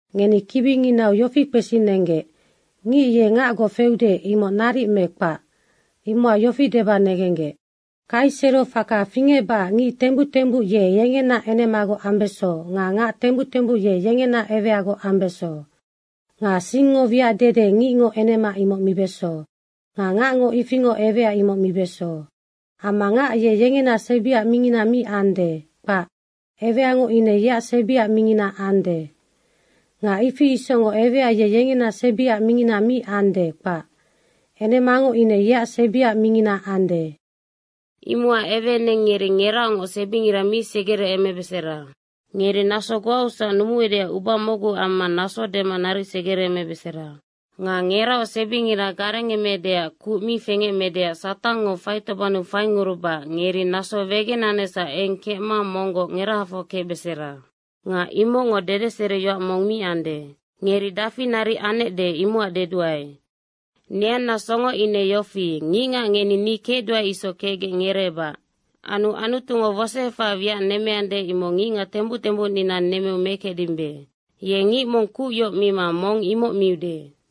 Ngeni kibinginau yofi kpesinenggec, “Ngic ye ngacgoc feude, imoc naric me kpac.” imocac yofi deba negenggec: Kaisero faka fingecbacac ngic tembuc tembuc ye yengena enemagoc ambeso nga ngac tembuc tembuc ye yengena eweagoc ambeso. Nga singngo wiac dede, ngicngo enema imoc mibeso nga ngacngo ifingoc ewea imoc mibeso. Amma ngac ye yengena sebiac mingina mi ande, kpac, eweango ine yeac sebiac mingina ande. Nga ifi isocngoc ewea ye yengena sebiac mingina mi ande, kpac. Enemango ine yeac sebiac mingina ande. Imocac eweeneng ngeri ngeraocngoc sebingira mi segereemebesera. Ngeri naso goausac numuecdeac uba mocgu amma naso dema naric segereemebesera. Nga ngeraoc sebingira garengemeecdeac kuc mi fengecmedeac Satangngo faitobannu faingurubacac ngeri naso wegenanecsac eng kecma monggoc ngerahafoc kecbesera. Nga imocngo dedeseriyoac mong mi ande. Ngeri dafi naric anecde imocac deduae. Neanna songo ine yofi, ngicngac ngeni ni kecduae isoc kecgec ngereebac. Anu Anutungo wosoefahaac wiac nemmeande, imoc ngicngac tembuc tembucnina nemmeu mekecdimbe. Ye ngic mong kuc yoc mima mong imoc miude.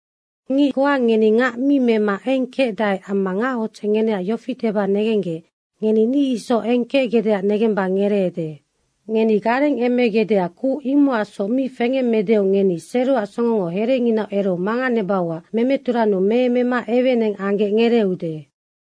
Ngic goa ngeni ngac mi mema eng kecdae amma ngachodzec ngeneac yofi deba negenggec, ngeni ni isoc eng kecgecdeac negemba ngereede. Ngeni garengemegecdeac kuc imocacsoc mi fengemmedeu, ngeni seroac songngo herenginau ereu manganebauac memeturannu meemema eweeneng anggec ngereeude.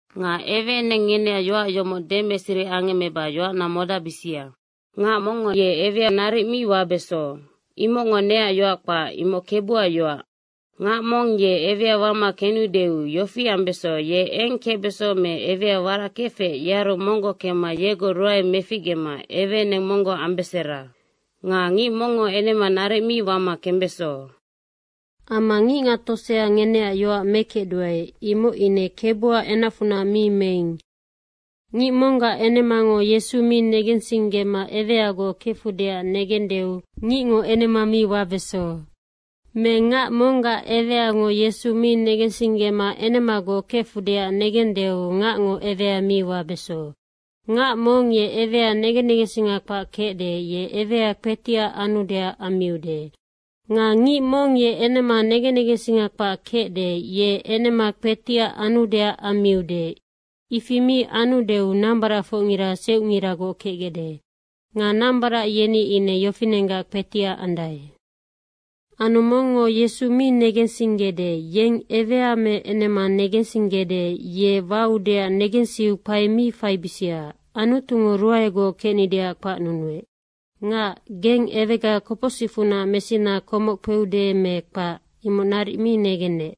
Nga eweeneng ngeneac yoac yomoc demeseri angemmeba yoacna modacbisia. Ngac mongngo ewea naric mi wabeso. Imocngo neac yoac kpac, imoc Kebuac yoac. Ngac mong ye ewea wama kenudeu yofi ambeso, ye eng kecbeso me ewea warac kefec, yearu monggoc kemma yegoc ruae meficgema eweeneng monggoc ambesera. Nga ngic mongngo enema naric mi wama kembeso. Amma ngicngac tosea ngeneac yoac mekecduae, imoc ine Kebuac enacfunac mi meing. Ngic monggac enemango Yesu mi negensinggema eweagoc kefudeac negendeu, ngicngo enema mi wabeso. Me ngac monggac eweango Yesu mi negensinggema enemagoc kefudeac negenudeu ngacngo ewea mi wabeso. Ngac mong ye ewea negen negensinga kpac kecde, ye ewea kpetiac anudeac ammiude. Nga ngic mong ye enema negen negensinga kpac kecde, ye enema kpetiac anudeac ammiude. Ifi mi anggecdeu nambaracfocngina seucnginagoc kecgecde. Nga nambarac yeni ine yofinenggac kpetiac andae. Anu mongngo Yesu mi negensinggede, yeng ewea me enema negensinggecde, ye waudeac negensiu kpae mi faibisia. Anutungo ruaegoc kecnideac kpacnunuec. Ngac, geng ewega kopocsicfunac mesina komoc kpeude me kpac, imoc naric mi negennec.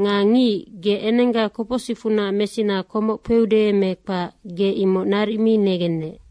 Nga ngic, ge enengga kopocsicfunac mesina komoc kpeude me kpac, ge imoc naric mi negennec.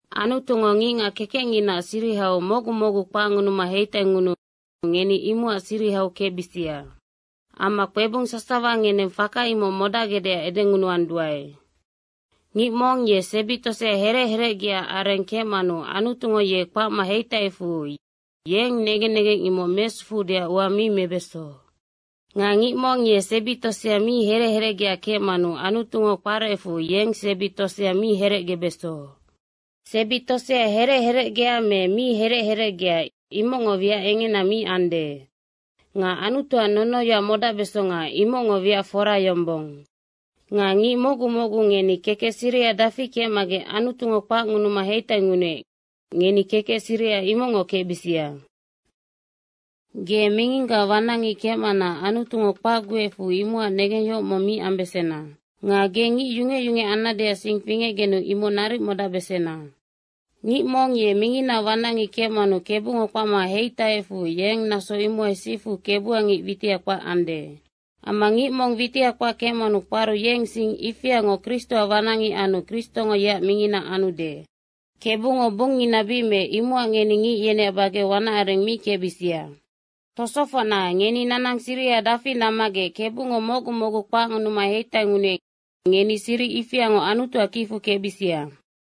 Anutungo ngicngac kekecnginaac sirihau mocgu mocgu kpacngunuma heitaingunuu ngeni imocac sirihau kecbisia. Amma kpebung sasawa ngeneng faka imoc modacgecdeac edengunuanduae. Ngic mong ye sebi tosea herec herecgeac areng kecmanu Anutungo ye kpacma heitaiecfu yeng negen negeng imoc mesufuudeac ua mi mebeso. Nga ngic mong ye sebi tosea mi herec herecgea kecmanu Anutungo kparecfu yeng sebi tosea mi herecgebeso. Sebi tosea herec herecgea me mi herec herecgea, imocngo wiac engena mi ande. Nga Anutuac nonoyoac modacbesonga, imocngo wiac fora yombong. Nga ngic mocgu mocgu ngeni kekec siriha dafi kecmagec Anutungo kpacngunuma heitaingunuec, ngeni kekec siriha imocngoc kecbisia. Ge minginggaac wanacngic kecmana Anutungo kpacguecfu imocac negengyohoc mong mi ambesena. Nga ge ngic yungec yungec annadeac sing fingecgenu imoc naric modacbesena. Ngic mong ye minginaac wanacngic kecmanu Kebungo kpacma heitaiecfu, yeng naso imohai sifu Kebuac ngic witiha kpac ande. Amma ngic mong witiha kpac kecmanu kparu, yeng sing ifiangoc Kristoac wanacngic anu Kristongo yeac mingina anude. Kebungo bungngina bic meec, imocac ngeni ngic yeneac bageu wanac areng mi kecbisia. Tosofocna, ngeni nanang siriha dafi nammagec Kebungo mocgu mocgu kpacngunuma heitaingunuec, ngeni siric ifiangoc Anutuac kicfu kecbisia.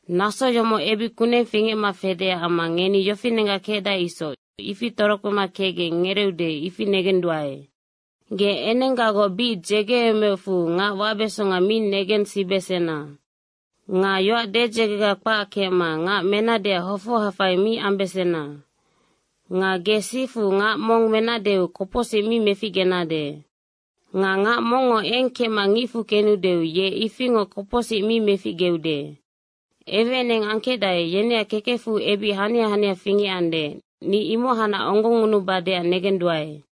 Naso yomoc ebic kuneng fingecma fedeac amma ngeni yofinenggac kecdae isoc, ifi torokpema kecgec ngereeude, ifi negenduae. Ge enenggagoc bic dzegeemeocfu ngac wabesonga mi negensibesena. Nga yoac dedzegega kpac kecma ngac menadeac hofoha fai mi ambesena. Nga ge sifu ngac mong menadeu kopocsic mi meficgenade. Nga ngac mongngo eng kecma ngicfu kenudeu ye ifingoc kopocsic mi meficgeude. Eweeneng angkecdae, yeneac kekecfu ebic hania hania fingecande, ni imohacnac onggongngunubadeac negenduae.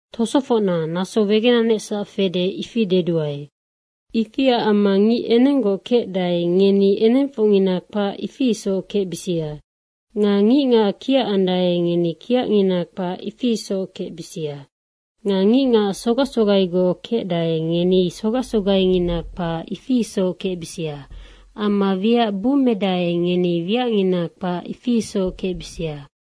Tosofocna, naso wegenanecsac fede, ifi deduae. Ifiac amma ngic enenggoc kecdae, ngeni enengfocngina kpac, ifi isoc kecbisia. Nga ngicngac kiackecdae, ngeni kiacngina kpac, ifi isoc kecbisia. Nga ngicngac sogac sogaigoc kecdae, ngeni sogac sogaingina kpac, ifi isoc kecbisia. Amma wiac bummedae, ngeni wiacngina kpac isoc kecbisia.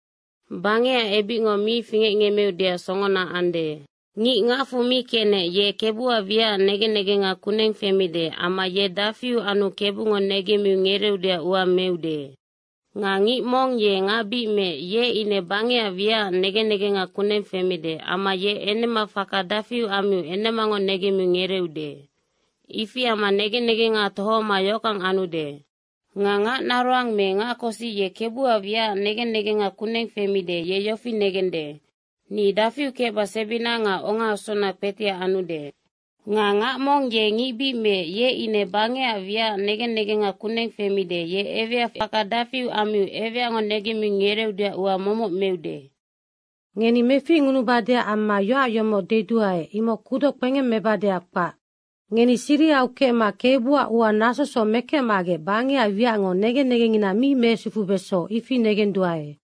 Bangecac ebicngo mi fingecngemmeudeac songona ande. Ngic ngacfu mi kenec, ye Kebuac wiacac negen negenga kuneng femide amma ye dafi anu Kebungo negemmiu ngereeudeac ua meude. Nga ngic mong ye ngac bic meec, ye ine bangecac wiacac negen negenga kuneng femide amma ye enema faka dafi ammiu enemango negemmiu ngereeude. Ifi amma negen negenga tohoma yohockang anude. Nga ngac naroang me ngac kosic ye Kebuac wiacac negen negenga kuneng femide, ye yofi negende, “Ni dafiu kecba sebina nga ongaasuna kpetiac anude.” Nga ngac mong ye ngic bic meec, ye ine bangecac wiacac negen negenga kuneng femide, ye ewea faka dafi ammiu eweango negemmiu ngereeudeac ua momoc meude. Ngeni meficngunubadeac amma yoac yomoc deduae, imoc kudoc kpengemmebadeac kpac. Ngeni sirihau kecma Kebuac ua nasosoc mekecmagec bangecac wiacngo negen negengngina mi mesufubeso, ifi negenduae.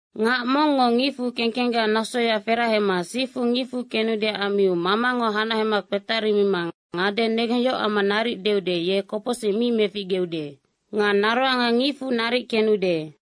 Ngac mongngo ngicfu kengkenggac nasoya ferahema sifu ngicfu kenudeac ammiu mamango hanahema kpetarima ngade negengyohoc amma naric deude, ye kopocsic mi meficgeude. Nga naroanga ngicfu naric kenude.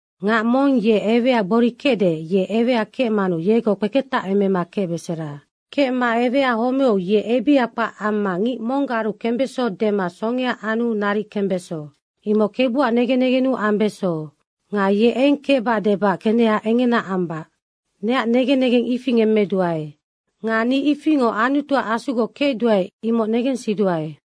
Ngac mong ye ewea gbori kecde, ye ewea kecmanu yegoc kpeketacemema kecbesera. Kecma ewea homeu ye ebiha kpac amma ngic monggaru kembeso dema songea anu naric kembeso. Imoc Kebuac negen negennu ambeso. Nga ye eng kecbac debac keneha engena ambac. Neac negen negeng ifi ngemmeduae. Nga ni ifingoc Anutuac Asugoc kecduae, imoc negensiduae.